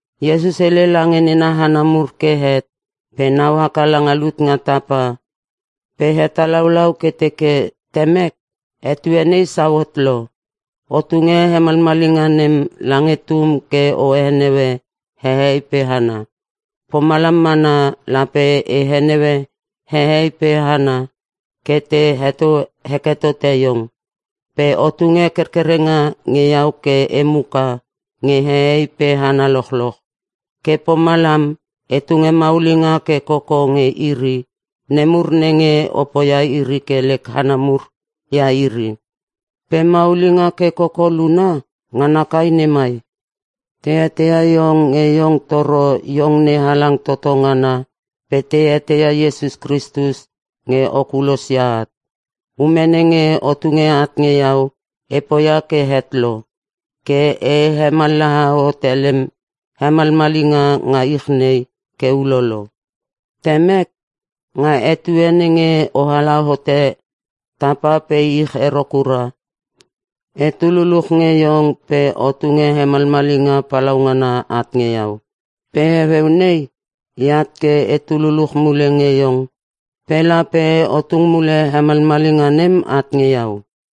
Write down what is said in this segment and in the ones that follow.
Iesus hele lange nena hana mur ke het pe nau haka langa lut nga tapa pe hetalaulau ke teke, “Temek, etue nei sauhot lo. O tunge hemalmalinga nem lange Tum ke o heneue hehei pe hana. Pomalam mana lape e heneue hehei pe hana ke te heto heke tote iong. Pe o tunge kerkerenga nge iau ke e muka nge hehei pe hana lochloch. Ke pomalam, e tunge maulinga ke koko nge iri nemur nenge o poia iri ke lek hana mur ia iri. Pe maulinga ke koko luna, ngana kai nei mai: Te eteia iong nge iong toro iong NeHalang toto ngana pe te eteia Iesus Kristus nge o kulos ia at. Ume nenge o tunge at nge iau e poia ke het lo. Ke e hemallaha hote lem hemalmalinga nga ich nei ke ulolo. Temek, nga etue nenge oala hote tapa pe ich ero kura, etu luluch nge iong pe o tunge hemalmalinga palaungana at nge iau. Pe heueu nei eat ke etu luluch mule nge iong pe lape o tung mule hemalmalinga nem at nge iau.”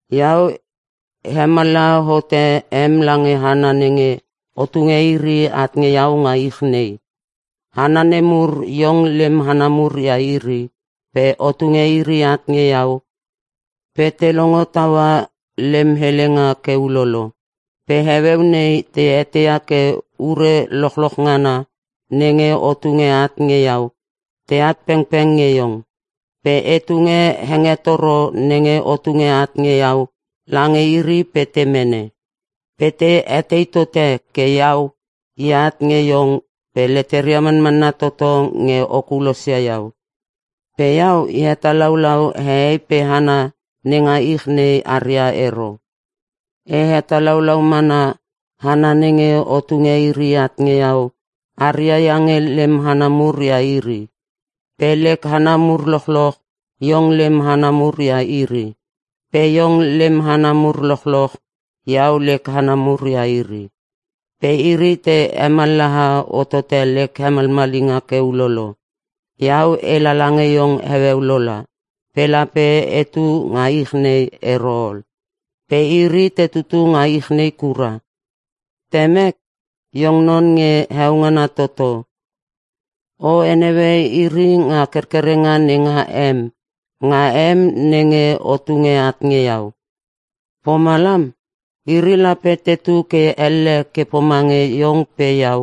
“Iau, e hemallaha hote em lange hana nenge o tunge iri at nge iau nga ich nei. Hana nemur iong lem hana mur ia iri pe o tunge iri at nge iau pe te longo taua lem helenga ke ulolo. Pe heueu nei te eteia ke ure lochloch ngana nenge o tunge at nge iau teat pengpeng nge Iong. Pe e tunge hengetoro nenge o tunge at nge iau lange iri pe te mene. Pe te etei tote ke iau eat nge iong pe leteria manmanna toto nge o kulosia iau. Pe iau e hetalaulau hehei pe hana nenga ich nei aria ero. E hetalaulau mana hana nenge o tunge iri at nge iau aria iange lem hana mur ia iri. Pe lek hana mur lochloch iong lem hana mur ia iri. Pe iong lem hana mur lochloch iau lek hana mur ia iri. Pe iri te hemallaha hotote lek hemalmalinga ke ulolo. Iau e lala nge iong heueu lola pe lape etu nga ich nei ero ol. Pe iri te tutu nga ich nei kura. Temek, Iong Non nge Heongana toto. O heneue iri nga kerkerenga nenga em, nga em nenge o tunge at nge iau. Pomalam, iri lape tetu ke elle ke pomange iong pe iau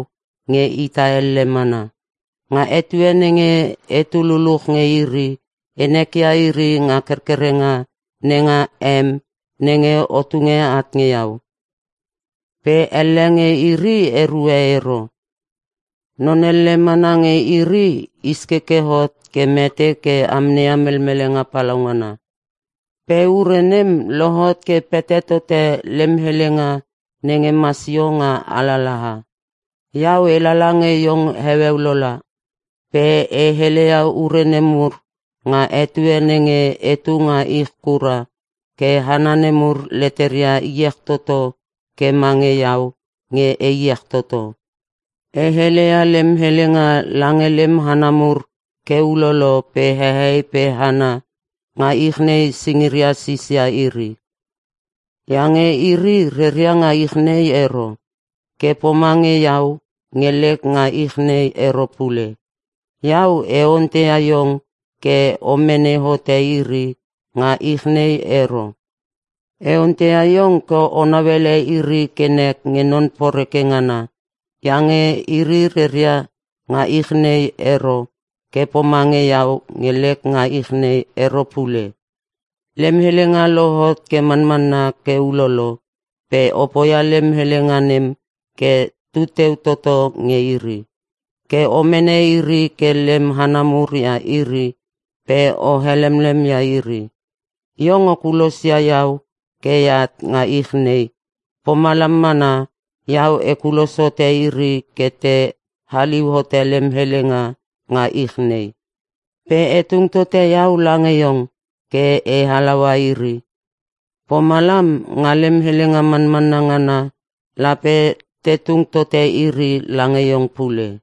nge ita elle mana. Nga etue nenge etu luluch nge iri e nekia iri nga kerkerenga nenga em nenge o tunge at nge iau. Pe elle nge iri erue ero. Non elle mana nge iri iskeke hot ke mete ke amneia melmelenga palaungana. Pe ure nem lohot ke pete tote lem helenga nenge masio nga alalaha. “Iau e lala nge iong heueu lola. Pe e heleia ure nemur nga etue nenge etu nga ich kura ke hana nemur leteria iech toto ke mange iau nge e iech toto. E heleia lem helenga lange lem hana mur ke ulolo pe hehei pe hana nga ich nei singiria sisia iri. Iange iri reria nga ich nei ero. Ke pomange iau nge lek nga ich nei ero pule. Iau e onteia iong ke o mene hote iri nga ich nei ero. E onteia iong ke o nauele iri ke nek nge non poreke ngana. Iange iri reria nga ich nei ero ke pomange iau nge lek nga ich nei ero pule. Lem helenga lohot ke manmanna ke ulolo pe o poia lem helenga nem ke tuteu toto nge iri. Ke o mene iri ke lem hana mur ia iri pe o helemlem ia iri. Iong o kulosia iau ke eat nga ich nei, pomalam mana iau e kulos hote iri ke te haliu hote lem helenga nga ich nei. Pe e tung tote iau lange iong ke e halaua iri. Pomalam, nga lem helenga manmanna ngana lape te tung tote iri lange iong pule.”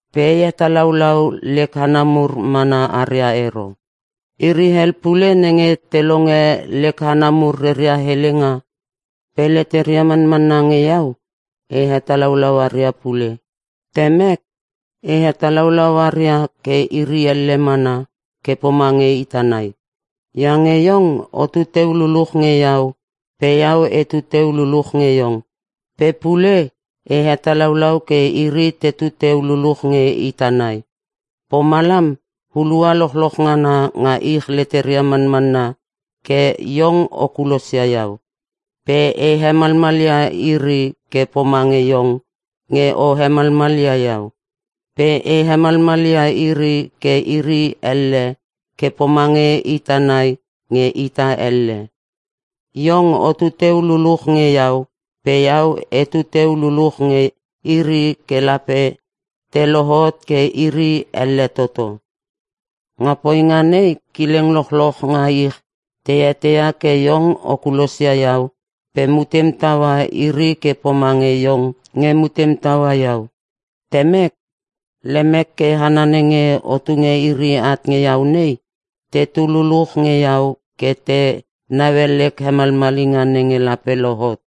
“Pe e hetalaulau lek hana mur mana aria ero. Iri hel pule nenge te longe lek hana mur reria helenga pe leteria manmanna nge iau, e hetalaulau aria pule. Temek, e hetalaulau aria ke iri elle mana ke pomange ita nai. Iange iong otu teu luluch nge iau pe iau etu teu luluch nge iong. Pe pule e hetalaulau ke iri tetu teu luluch nge ita nai. Pomalam hulua lochloch ngana nga ich leteria manmanna ke iong o kulosia iau. Pe e hemalmal ia iri ke pomange iong nge o hemalmal ia iau. Pe e hemalmal ia iri ke iri elle ke pomange ita nai nge ita elle. Iong otu teu luluch nge iau pe iau etu teu luluch nge iri ke lape te lohot ke iri elle toto. Nga poinga nei kileng lochloch nga ich te eteia ke iong o kulosia iau pe mutem taua iri ke pomange iong nge mutem taua iau. “Temek, lemek ke hana nenge o tunge iri at nge iau nei tetu luluch nge iau ke te naue lek hemalmalinga nenge lape lohot.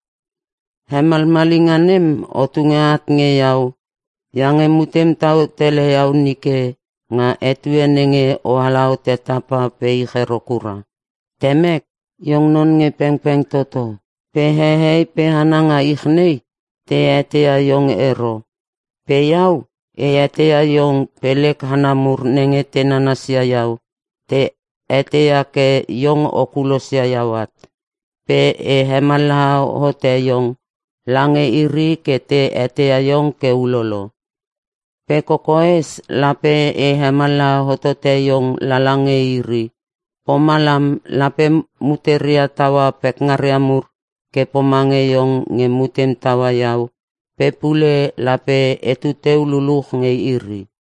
Hemalmalinga nem o tunge at nge iau iange mutem tau tele iau nike nga etue nenge oala hote tapa pe ich ero kura. “Temek, iong non nge pengpeng toto pe hehei pe hana nga ich nei te eteia iong ero. Pe iau e eteia iong pe lek hana mur nenge te nanasia iau te eteia ke iong o kulosia iau at. Pe e hemallaha hote iong lange iri ke te eteia iong ke ulolo. Pe kokoes lape e hemallaha hottote iong lala nge iri. Pomalam lape muteria taua pekngaria mur ke pomange iong nge mutem taua iau pe pule lape etu teu luchluch nge iri.”